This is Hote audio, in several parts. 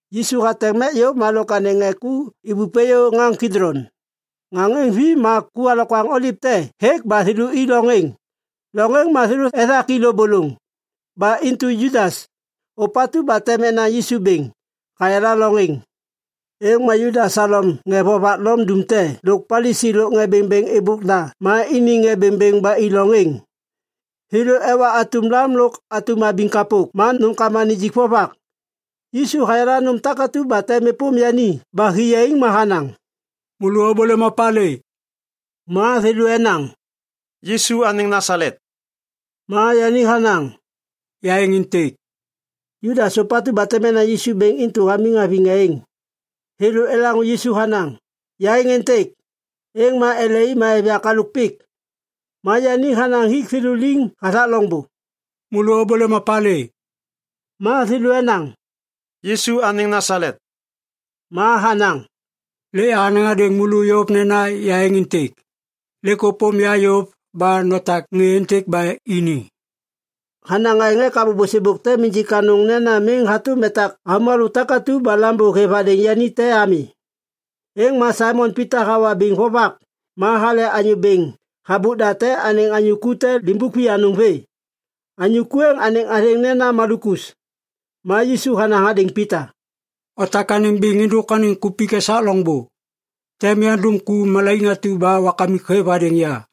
Yisu hateŋ mek yôv ma lôk anêŋ ŋê ku ibup êyô ŋaŋ Kidlon. Ŋaŋ êŋ vi ma ku alokwaŋ oliv te hêk ba thêlô i loŋ êŋ. Loŋ êŋ ma thêlô ethak i lôbôlôŋ. Ba intu Judas, ôpatu ba tem enaŋ Yisu bêŋ, hayala loŋ êŋ. Êŋ ma Judas halom ŋê vovak Lom dumte lôk Palisi lôk ŋê bêŋbêŋ êbôk da ma iniŋ ŋê bêŋbêŋ ba i loŋ êŋ. Thêlô ewa atum lam lôk atum abiŋ kapok ma nômkama nijik vovak. Yisu hayala nôm takatu ba tem êpôm yani ba hi yaiŋ ma hanaŋ, “Môlô ôbôlêm opalê?” Ma thêlô enaŋ, “Yisu anêŋ Nasalet.” Ma yani hanaŋ, “Ya êŋ êntêk.” Judas, ôpatu ba tem enaŋ Yisu bêŋ intu hamiŋ haviŋ ŋê êŋ. Thêlô elaŋô Yisu hanaŋ, “Ya êŋ êntêk.” Êŋ ma ele i ma êv yak halôk pik. Ma yani hanaŋ hik thêlô liŋ hathak loŋbô, “Môlô ôbôlêm opalê?” Ma thêlô enaŋ, “Yisu anêŋ Nasalet.” Ma hanaŋ, “Lêk yahanaŋ hadêŋ môlô yôv nena ya êŋ êntêk. Lêk ôpôm ya yôv ba notak ŋê êntêk ba ini.” Hanaŋ aêŋ ek abô bôsêbôk tem injik anôŋ nena miŋ hatôm etak avômalô takatu ba Lambô hêv hadêŋ yani te ami. Êŋ ma Saimon Pita hawa biŋ vovak ma hale anyô bêŋ habôk da anêŋ anyô ku te limbuk vianôŋ vê. Anyô ku êŋ anêŋ athêŋ nena Malukus. Ma Yisu hanaŋ hadêŋ Pita, “Otak anêm biŋ êndôk anêŋ kupik esak loŋbô! Tem yandum ku malaiŋ atu ba Wakamik hêv hadêŋ ya.”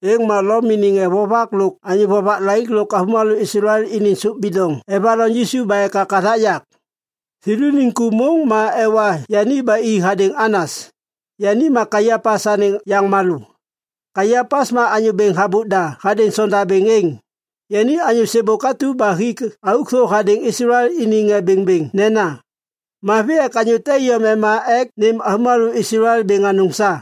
Êŋ ma Lom iniŋ ŋê vovak lôk anyô vovak laik lôk avômalô Islael iniŋ sôp bidoŋ evaloŋ Yisu ba ekak hathak yak. Thêlôniŋ ku môŋ ma ewa yani ba i hadêŋ Anas, yani ma Kaiapas anêŋ yaŋmalô. Kaiapas ma anyô bêŋ habôk da hadêŋ sondabêŋ êŋ. Yani anyô sêbôk atu ba hik auk thô hadêŋ Islael iniŋ ŋê bêŋbêŋ nena, “Mavi ek anyô te iyom ema ek nêm avômalô Islael bêŋ anôŋ sa.”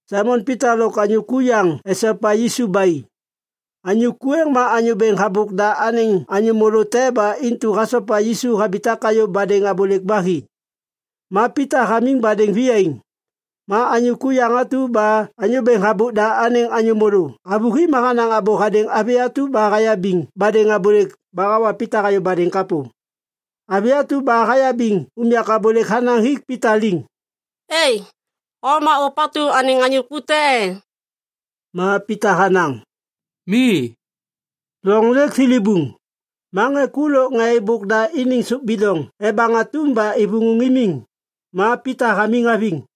Saimon Pita lôk anyô ku yaŋ esopa Yisu ba i. Anyô ku êŋ ma anyô bêŋ habôk da anêŋ anyô môlô te ba intu hasopa Yisu habitak hayô badêŋ abôlêk ba hi. Ma Pita hamiŋ badêŋ viyaiŋ. Ma anyô ku yaŋ atu ba anyô bêŋ habôk da anêŋ anyô môlô havôhi ma hanaŋ abô hadêŋ avi atu ba hayabiŋ badêŋ abôlêk ba hawa Pita hayô badêŋ kapô. Avi atu ba hayabiŋ unyak abôlêk hanaŋ hik Pita liŋ, “E! O ma ôpatu anêŋ anyô ku te e?” Ma Pita hanaŋ, “Mi.” Loŋ lêk thilibuŋ. Ma ŋê ku lôk ŋê êbôk da iniŋ sôp bidoŋ ebaŋ atum ba ivuŋu imiŋ. Ma Pita hamiŋ haviŋ.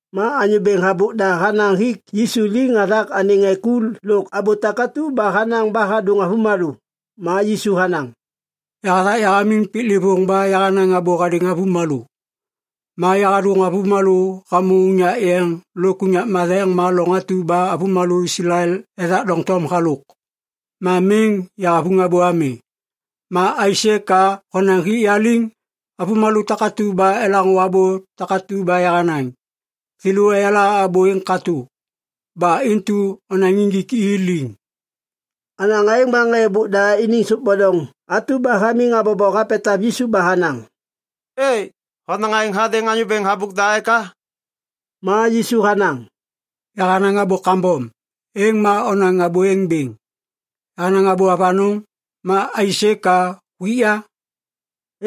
Ma anyô bêŋ habôk da hanaŋ hik Yisu liŋ hathak anêŋ ŋê ku lôk abô takatu ba hanaŋ ba hadôŋ avômalô. Ma Yisu hanaŋ, “Yahathak yahamiŋ piklêvôŋ ba yahanaŋ abô hadêŋ avômalô. Ma yahadôŋ avômalô hamô unyak yeŋ lôk unyak matheŋ ma loŋ atu ba avômalô Islael ethak doŋtom halôk. Ma miŋ yahavuŋ abô ami. Ma aisê ka honaŋ hik ya liŋ? Avômalô takatu ba elaŋô abô takatu ba yahanaŋ, thêlô eyala abô êŋ katô. Ba intu onaŋ injik i liŋ.” Hanaŋ aêŋ ma ŋê êbôk da iniŋ sôp bidoŋ atu ba hamiŋ habobo hapetav Yisu ba hanaŋ, “E! Honaŋ aêŋ hadêŋ anyô bêŋ habôk da eka?” Ma Yisu hanaŋ, “Yahanaŋ abô kambom, êŋ ma onaŋ abô êŋ bêŋ. Yahanaŋ abô avanôŋ, ma aisê ka huik ya?”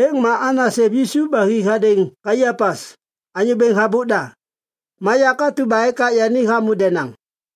Êŋ ma Anas hêv Yisu ba hi hadêŋ Kaiapas, anyô bêŋ habôk da. Ma yak atu ba ekak yani hamô denaŋ.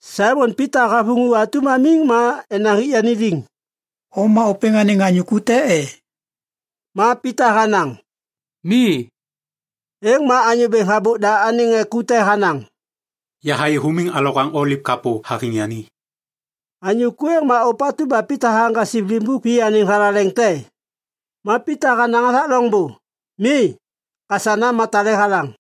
Saimon Pita havuŋu atum hamiŋ ma enaŋ hik yani liŋ, “O ma ôpêŋ anêŋ ŋê ku te e?” Ma Pita hanaŋ, “Mi.” Êŋ ma anyô bêŋ habôk da anêŋ ŋê ku te hanaŋ, “Yahayê humiŋ alokwaŋ oliv kapô haviŋ yani.” Anyô ku êŋ ma ôpatu ba Pita haŋgasiv limbuk vê anêŋ thalaleŋ te. Ma Pita hanaŋ hathak loŋbô, “Mi.” Kasana ma tale halaŋ.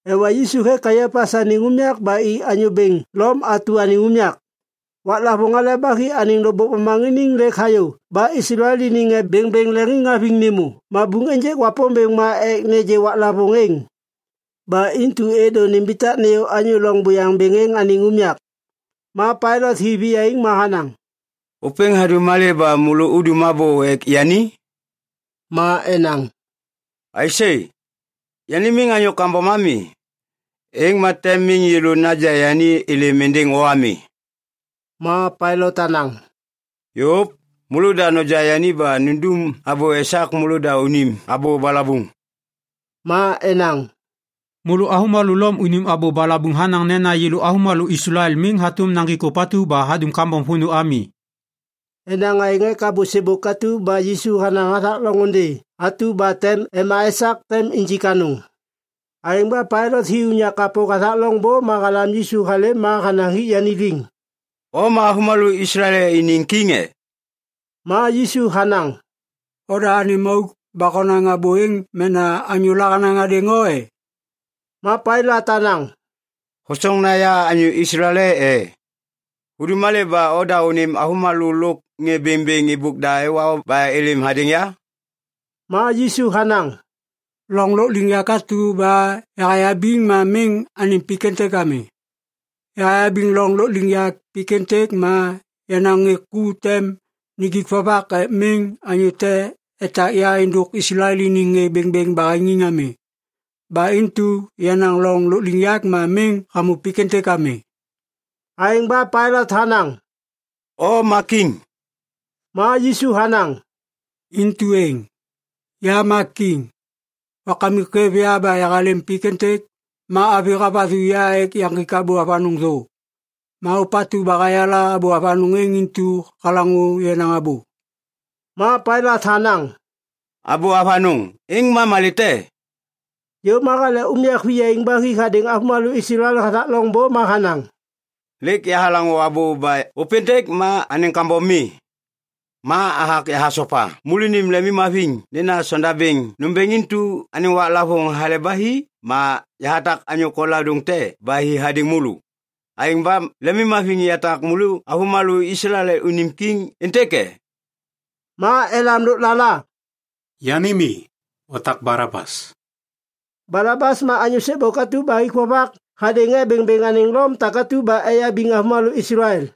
Ewa Yisu hêk Kaiapas anêŋ unyak ba i anyô bêŋ Lom atu anêŋ unyak. Waklavôŋ Hale ba Hi anêŋ lôkbôk momaŋiniŋ lêk hayô ba Islael iniŋ ŋê bêŋbêŋ leŋiŋhaviŋ nêmô mabuŋ ênjêk Wapômbêŋ ma ek nêgê waklavôŋ êŋ. Ba intu êdô nimbitak nêyô anyô loŋ buyaŋ bêŋ êŋ anêŋ unyak. Ma Pailat hi viyaiŋ ma hanaŋ, “Ôpêŋ hadum malê ba môlô udum abô ek yani?” Ma enaŋ, “Aisê! Yani miŋ anyô kambom ami, êŋ ma tem miŋ yêlô naja yani êlêm êndêŋ o ami!” Ma Pailat hanaŋ, “Yôv! Môlôda noja yani ba nundum abô esak môlôda unim abô balabuŋ.” Ma enaŋ, “Môlô avômalô Lom unim abô balabuŋ hanaŋ nena yêlô avômalô Islael miŋ hatôm naŋgik ôpatu ba hadum kambom vônô ami.” Enaŋ aêŋ ek abô sêbôk atu ba Yisu hanaŋ hathak loŋôndê atu ba tem ema esak tem injik anôŋ. Aêŋ ba Pailat hi unyak kapô hathak loŋbô ma halam Yisu halêm ma hanaŋ hik yani liŋ, “O ma avômalô Islael iniŋ kiŋ e?” Ma Yisu hanaŋ, “Oda anêm auk ba honaŋ abô êŋ mena anyôla hanaŋ hadêŋ o e?” Ma Pailat hanaŋ, “Hosoŋ nena ya anyô Islael e? Hudum malê ba oda anêm avômalô lôk ŋê bêŋbêŋ êbôk da ewa o ba êlêm hadêŋ ya?” Ma Yisu hanaŋ, “Loŋ lôkliŋyak atu ba yahayabiŋ ma miŋ anêŋ pik êntêk ami. Yayabiŋ loŋ lôkliŋyak pik êntêk ma yenaŋ ŋê ku tem nijik vovak ek miŋ anyô te etak ya êndôk Islael iniŋ ŋê bêŋbêŋ baheŋiŋ ami. Ba intu yenaŋ loŋ lôkliŋyak ma miŋ hamô pik êntêk ami.” Aêŋ ba Pailat hanaŋ, “O ma kiŋ!” Ma Yisu hanaŋ “Intu êŋ. Ya ma kiŋ. Wakamik hêv ya ba yahalêm pik êntêk ma avi havathu ya ek yaŋgik abô avanôŋ thô. Ma ôpatu ba hayala abô avanôŋ êŋ intu halaŋô yenaŋ abô.” Ma Pailat hanaŋ, “Abô avanôŋ, êŋ ma malê te?” Yôv ma hale unyak viyaiŋ ba hi hadêŋ avômalô Islael hathak loŋbô ma hanaŋ, “Lêk yahalaŋô abô ba ôpêntêk ma anêŋ kambom mi. Ma yahathak yahasopa môlônim lemimhaviŋ nena sondabêŋ nômbêŋ intu anêŋ waklavôŋ Hale ba Hi ma yahatak anyô koladôŋ te ba hi hadêŋ môlô. Aêŋ ba lemimhaviŋ yatak môlô avômalô Islael unim kiŋ êntêk e?” Ma elam lôklala, “Yani mi. Otak Balabas!” Balabas ma anyô sêbôk atu ba hik vovak hadêŋ ŋê bêŋbêŋ anêŋ Lom takatu ba eyabiŋ avômalô Islael.